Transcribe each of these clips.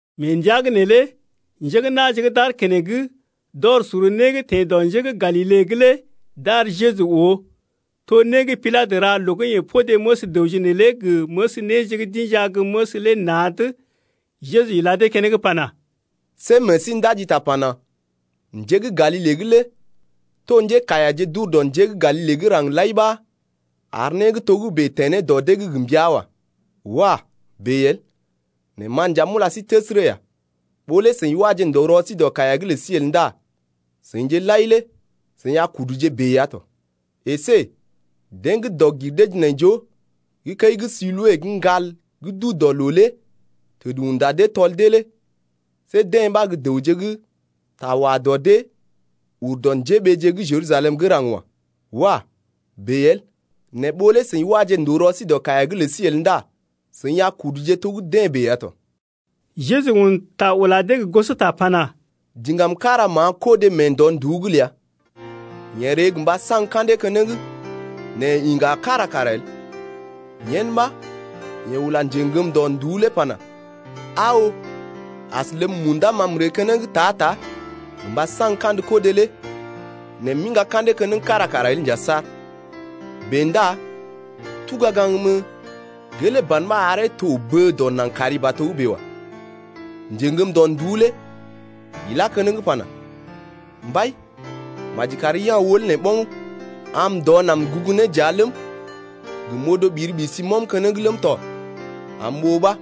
Mee ndəa’g neelé njé gə́ na̰je gə́ d’aar keneŋ, d’ɔr sor né gə́ teḛ dɔ njé gə́ Galile’g lé d’ar Jeju oo, to né gə́ Pilatə ra loo gə́ yeḛ podé məs dəwje neelé gə məs néje gə́ d’inja gə́ məs lé na̰’d. Jeju ila dee keneŋ pana: See meḛ sí ndaji ta pana: Njé gə́ Galile’g lé to njékaiyaje d’ur dɔ njé gə́ Galile gə́ raŋg lai ɓa ar né gə́ togə́bè teḛ ne dɔ dee’g gə mbəa wa. Wah! bèe el. Nɛ ma nja m’ula sí təsərə ya, ɓó lé seḭ waje ndòo rɔ sí dɔ kaiya’g lə sí el ndá seḭje lai lé seḭ a kuduje bèe ya tɔ. Esé deḛ gə́ dɔg-gir-dee-jinaijoo gə́ kəi gə́ Siloe gə́ ŋgal gə́ duu dɔ loo lé təd unda dee tɔl dee lé see deḛ ɓa gə́ dəwje gə́ ta wa dɔ dee ur dɔ njéɓeeje gə́ Jerusalem gə́ raŋg wa. Wah! bèe el. Nɛ ɓó lé seḭ waje ndòo rɔ sí dɔ kaiya’g lə sí el ndá seḭ a kuduje to gə́ deḛ bèe ya tɔ. Jeju un ta ula dee gə gosota pana: Diŋgam kára ma̰a kodé mee ndɔ-nduú’g ləa. Yeḛ ree gə mba saŋg ka̰dee keneŋ nɛ yeḛ iŋga kára kara el. Yen ɓa yeḛ ula njeŋgəm ndɔ-nduú lé pana: Aa oo, as ləb munda ma m’ree keneŋ ta-ta gə mba saŋg kandə kodé lé nɛ m’iŋga ka̰dee keneŋ kára kara el nja saar. Bèe ndá tuga gaŋg mən, gelee ban ɓa aree to bə dɔ naŋg kari ba togə́bè wa. Njeŋgəm ndɔ-nduú lé ilá keneŋ pana: Mbai, maji kari ya̰ wəl nee ɓoŋ am m’ndɔ naŋg m’gugu ne dəa ləm, gə m’odo ɓiri-ɓisi m’ɔm keneŋ ləm tɔ am m’oo ɓa.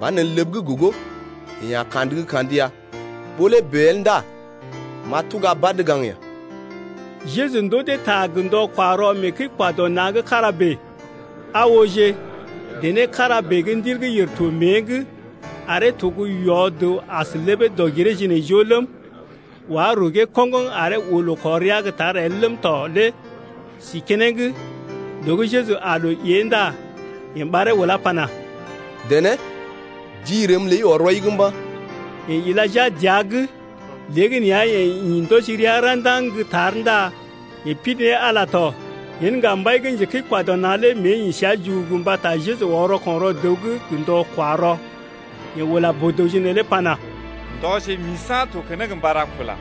Banelə ləb gə́ gogo yee a kandə gə́ kandə ya, ɓó lé bèe el ndá m’a tuga badə gaŋg ɓəi. Jeju ndoo dee ta gə ndɔ-kwa-rɔ mee kəi-kwa-dɔ-na̰ gə́ kára bèe. Aa ooje, dené kára bèe gə́ ndil gə́ yèr to mée’g aree to gə́ yɔ-dəw as ləbee dɔg-giree-jinaijoo ləm, wá rugee koŋgoŋ aree oo loo kɔr rəa gə́ tar el ləm tɔ lé si keneŋ. Loo gə́ Jeju aa loo ée ndá yeḛ ɓaree ulá pana: Dené, ji rəm ləi ɔr rɔi’g mba̰. Yeḛ ila jia dəa’g. Léegəneeya yeḛ ḭ ndɔji rəa ra̰daŋ gə́ tar ndá yeḛ pidi ne Ala tɔ. Yen ŋga mbai gə́ njekəi-kwa-dɔ-na̰ lé mée ḭ səa jugugu mbata Jeju ɔr rɔko̰ rɔ dəw’g gə ndɔ-kwa-rɔ. Yeḛ ula boo-dəwje neelé pana: Ndɔje gə́ misa̰ to keneŋ mba ra kula.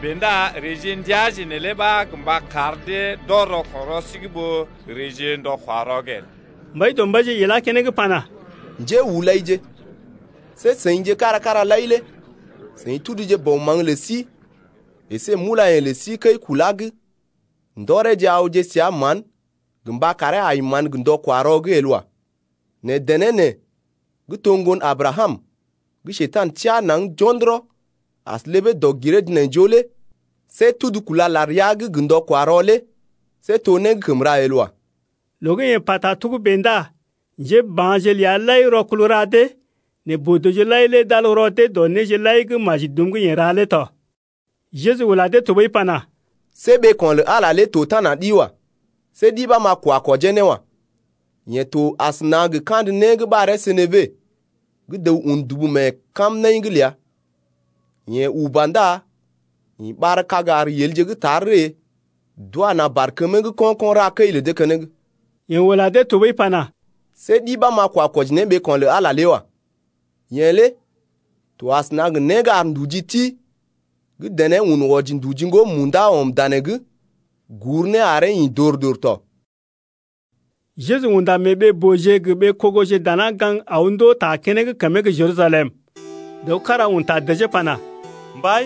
Bèe ndá reeje gə ndəaje neelé ɓa gə mba kar dee d’ɔr rɔko̰ rɔ sí’g ɓó reeje gə ndɔ-kwa-rɔ el. Mbaidɔmbaije ilá keneŋ pana, Njéhulaije, see seḭje kára kára lai lé seḭ tuduje bɔ maŋg lə sí əsé mulayḛ̀je lə sí kəi-kulee’g ndɔreje awje səa mán gə mba karee ai mán gə ndɔ-kwa-rɔ’g el wa. Nɛ dené nee gə́ to gə́ ŋgon Abrakam gə́ Njekurai teá naŋg jo̰dɔrɔ as ləbee dɔg-giree-jinaijoo lé see tudu kúla lar rəa’g gə ndɔ-kwa-rɔ lé see to né gə́ kəm ra el wa. Loo gə́ yeḛ pa togə́bè ndá njéba̰je ləa lai rɔkul ra dee, nɛ boo-dəwje lai lé d’al rɔ dee wɔji dɔ néje lai gə́ maji dum gə́ yeḛ ra lé tɔ. Jeju ula dee tɔɓəi pana: See ɓeeko̰ lə Ala lé to tana ɗi wa. See ɗi ɓa m’a kwa kwɔjee ne wa. Yee to asəna gə kandə né gə́ ɓaree senebe gə́ dəw un dubu mee kamnaḭ’g ləa, yeḛ uba ndá ḭ ɓar-kag ar yelje gə́ tar ree d’wa na̰ barkəmee’g ko̰-ko̰ ra kəi lə dee keneŋ. Yeḛ ula dee tɔɓəi pana: See ɗi ɓa m’a kwa kwɔji ne ɓeeko̰ lə Ala lé wa. Yee lé to asəna gə né gə́ ar nduji ti gə́ dené un wɔji nduji ŋgo munda ɔm danee’g gur ne aree ḭ dor-dor tɔ. Jeju unda mee ɓee-booje gə ɓee-kogoje dana gaŋg aw ndoo ta keneŋ kəmee gə́ Jerusalem. Dəw kára un ta dəjee pana, Mbai,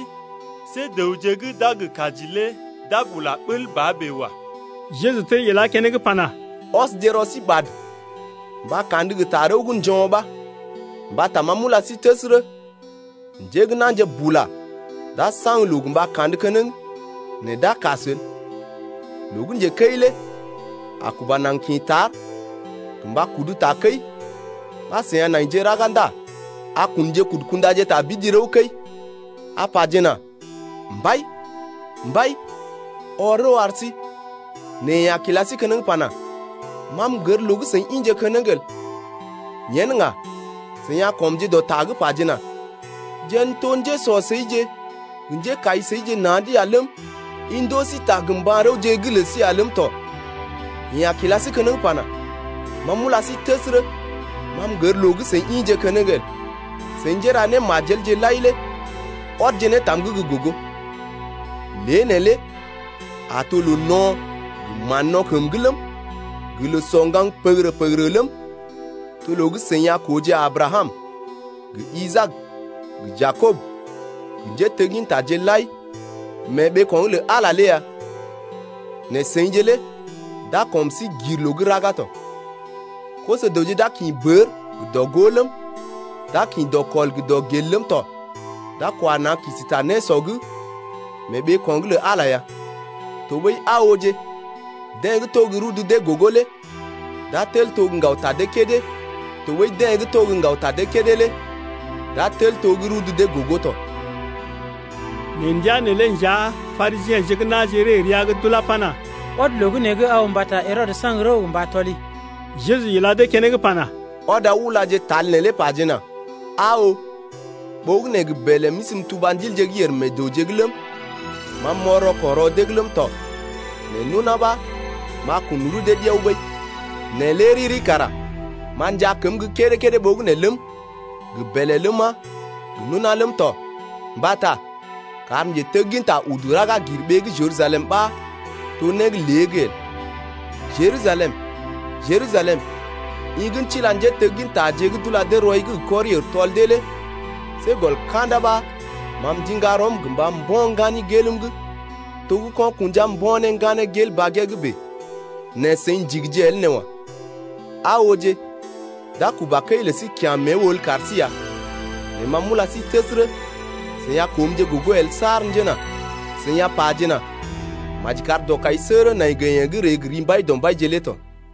see dəwje gə́ d’a gə kaji lé d’a bula bəl ba bèe wa. Jeju tel ilá keneŋ pana: Ɔsje rɔ sí ɓad mba kandə gə tarəw gə́ njo̰ ɓa. Mbata ma m’ula sí təsərə, njé gə́ na̰je bula d’a saŋg loo gə mba kandə keneŋ nɛ d’a kas el. Loo gə́ njekəi lé a kuba naŋg kḭ tar gə mba kudu takəi ɓa seḭ a naije raga ndá a kunje kudu kundaje tabidi rəw-kəi, a pajena: Mbai, mbai, ɔr rəw ar sí. Nɛ yeḛ a kila sí keneŋ pana: Ma m’gər loo gə́ seḭ ḭje keneŋ el. Yen ŋga seḭ a kɔmje dɔ ta’g pajena: Jeḛ n’toje gə́ njésɔ seḭje gə njékai seḭje na̰’d ya ləm, i ndoo sí ta gə mba̰-rəwje gə́ lə sí ya ləm tɔ. Yeḛ a kila sí keneŋ pana, ma m’ula sí təsərə, ma m’gər loo gə́ ḭje keneŋ el. Seḭ njéra némajelje lai lé ɔdje ne tam’g gə́ gogo. Lée neelé a to loo no̰ gə mán-no̰ kəm’g ləm, gə loo sɔ ŋgaŋ pəgərə-pəgərə ləm tɔ loo gə́ seḭ a kooje Abrakam gə Isaak gə Jakob gə njéteggintaje lai mee ɓeeko̰’g lə Ala lé ya nɛ seḭje lé d’a kɔm sí gir loo’g raga tɔ. Koso-dəwje d’a kḭ bər gə dɔ-gó ləm, d’a kḭ dɔkɔl gə dɔgel ləm tɔ, d’a kwa na̰ kisi ta nésɔ’g mee ɓeeko̰’g lə Ala ya. Tɔɓəi aa ooje, deḛ gə́ to gə́ rudu dee gogo lé d’a tel to gə́ ŋgaw ta dee kédé, tɔɓəi deḛ gə́ to gə́ ŋgaw ta dee kédé lé d’a tel to gə́ rudu dee gogo tɔ. Mee ndəa neelé nja Parisiḛje gə́ na̰je ree rəa’g d’ulá pana: Ɔd loo gə́ nee’g aw mbata Herɔdə saŋg rəw gə mba tɔli. Jeju ila dee keneŋ pana: Ɔd aw ulaje pajena: Aa oo, ɓogənè gə bèlè m’isi m’tuba ndilje gə́ yèr meḛ dəwje’g ləm, ma m’ɔr rɔko̰ rɔ dee’g ləm tɔ, nɛ nona ɓa m’a kun rudee ɗiao ɓəi. Nɛ lé riri kara m’a njaa kəm gə́ kédé-kédé ɓogənè ləm, gə bèlè ləma, gə nona ləm tɔ, mbata kar njetegginta udu raga gir ɓee gə́ Jerusalem ɓa to né gə́ lée’g el. Jerusalem, Jerusalem, i gə́ tila njéteggintaje gə́ d’ula dee rɔi’g gə kɔri-ər tɔl dee lé see gɔl ka̰da ɓa ma m’ndiŋga rɔm gə mba mbo̰ ŋgani gelm’g to gə́ ko̰ kṵja mbo̰ ne ŋganee gel bagee’d bèe nɛ seḭ ndigije el nee wa. Aa ooje, d’a kuba kəi lə sí kya̰ mée wəl kar sí ya, nɛ ma m’ula sí təsərə, seḭ a koomje gogo el saar njena seḭ a pajena: Maji kar dɔkaisəgərə nai gə yeḛ gə́ ree gə ri Mbaidɔmbaije lé tɔ.